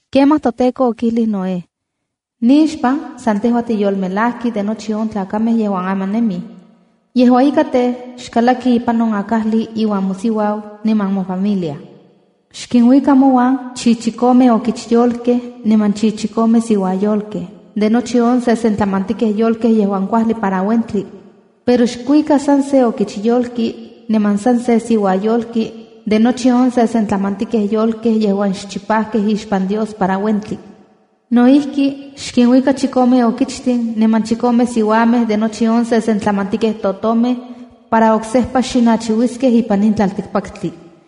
Kemaj toTEKO okijlij Noé: “Nixpan san tejua tiyolmelajki de nochi on tlakamej yejuan aman nemij. Yejua ika tej, xkalaki ipan on akajli iuan mosiuau niman mofamilia. Xkinuika mouan chichikome okichyolkej niman chichikome siuayolkej de nochi on sesentlamantikej yolkej yejuan kuajli para uentli. Pero xkuika san se okichyolki niman san se siuayolki de nochi on sesentlamantikej yolkej yejuan xchipajkej ixpan Dios para uentli. No ijki, xkinuika chikome okichtin niman chikome siuamej de nochi on sesentlamantikej totomej para oksejpa xinachiuiskej ipan in tlaltikpaktli.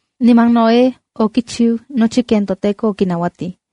Niman Noé okichiu nochi ken toTEKO okinauatij.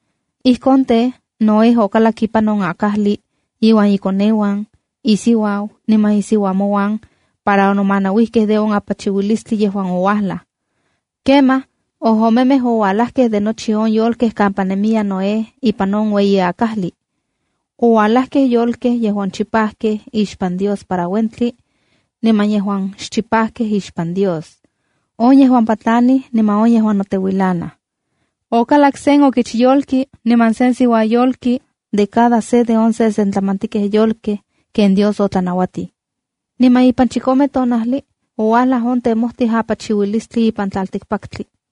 Ijkon tej, Noé okalak ipan on akajli iuan ikoneuan, isiuau niman isiuamonuan para onomanauijkej de on apachiuilistli yejuan ouajlaj. Kemaj ojomemej oualajkej de nochi on yolkej kampa nemiya Noé ipan on ueyi akajli. Oualajkej yolkej yejuan chipajkej ixpan Dios para uentli, niman yejuan xchipajkej ixpan Dios, on yejuan patlanij niman on yejuan noteuilanaj. Okalakkej sen okichyolki niman sen siuayolki de cada se on sesentlamantikej yolkej ken Dios otlanauatij. Niman ipan chikome tonajli, ouajlaj on temojtij apachiuilistli ipan tlaltikpaktli.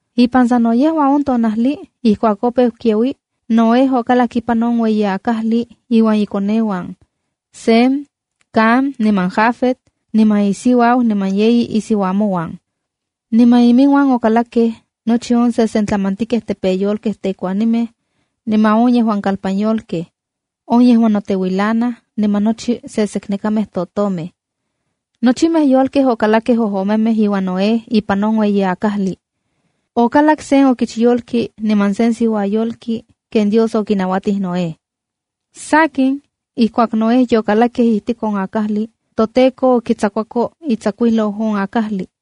Ipan sa no yejua on tonajli ijkuak opeu kiaui, Noé okalak ipan on ueyi akajli iuan ikoneuan, Sem, Cam niman Jafet niman isiuau niman yeyi isiuamonuan. Niman iminuan okalakkej nochi on sesentlamantikej tepeyolkej tekuanimej, niman on yejuan kalpanyolkej, on yejuan noteuilanaj, niman nochi seseknekamej totomej. Nochimej yolkamej okalakkej ojomemej iuan Noé ipan on ueyi akajli. Okalakkej sen okichtli niman sen siuatl ken Dios okinauatij Noé. Sakin, ijkuak Noé yokalakkej ijtik on akajli, toTEKO okitsakuako itsakuijlou on akajli.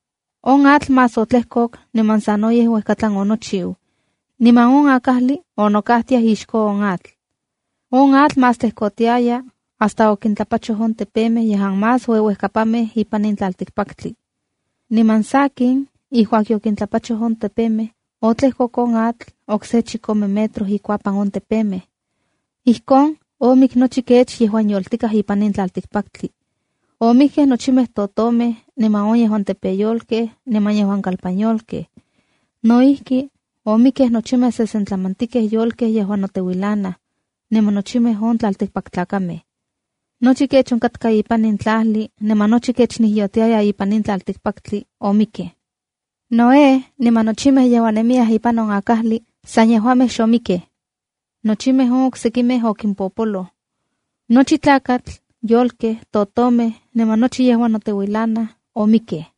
On atl más otlejkok niman sanoyej uejkatlan onochiu, niman on akajli onokajtiaj ixko on atl. On atl más tlejkotiaya hasta okintlapachoj on tepemej yejuan más ueuejkapanmej ipan tlaltikpaktli. Niman sakin, ijkuak yokintlapachoj on tepemej, otlejkok on atl okse chikome metro ikuapan on tepemej. Ijkon omik nochi kech yejuan yoltikaj ipan in tlaltikpaktli. Omikkej nochimej totomej, niman on yejuan tepeyolkej, niman yejuan kalpanyolkej. No ijki, omikkej nochimej sesentlamantikej yolkej yejuan noteuilanaj, niman nochimej on tlaltikpaktlakamej. Nochi kech onkatkaj ipan tlajli niman nochi kech nijyotiaya ipan in tlaltikpaktli omikkej. Noé niman nochimej yejuan nemiyaj ipan on akajli san yejuamej xomikkej. Nochimej on oksekimej okimpoloj. Nochi tlakatl, yolkej, totomej niman nochi yejuan noteuilanaj omikkej.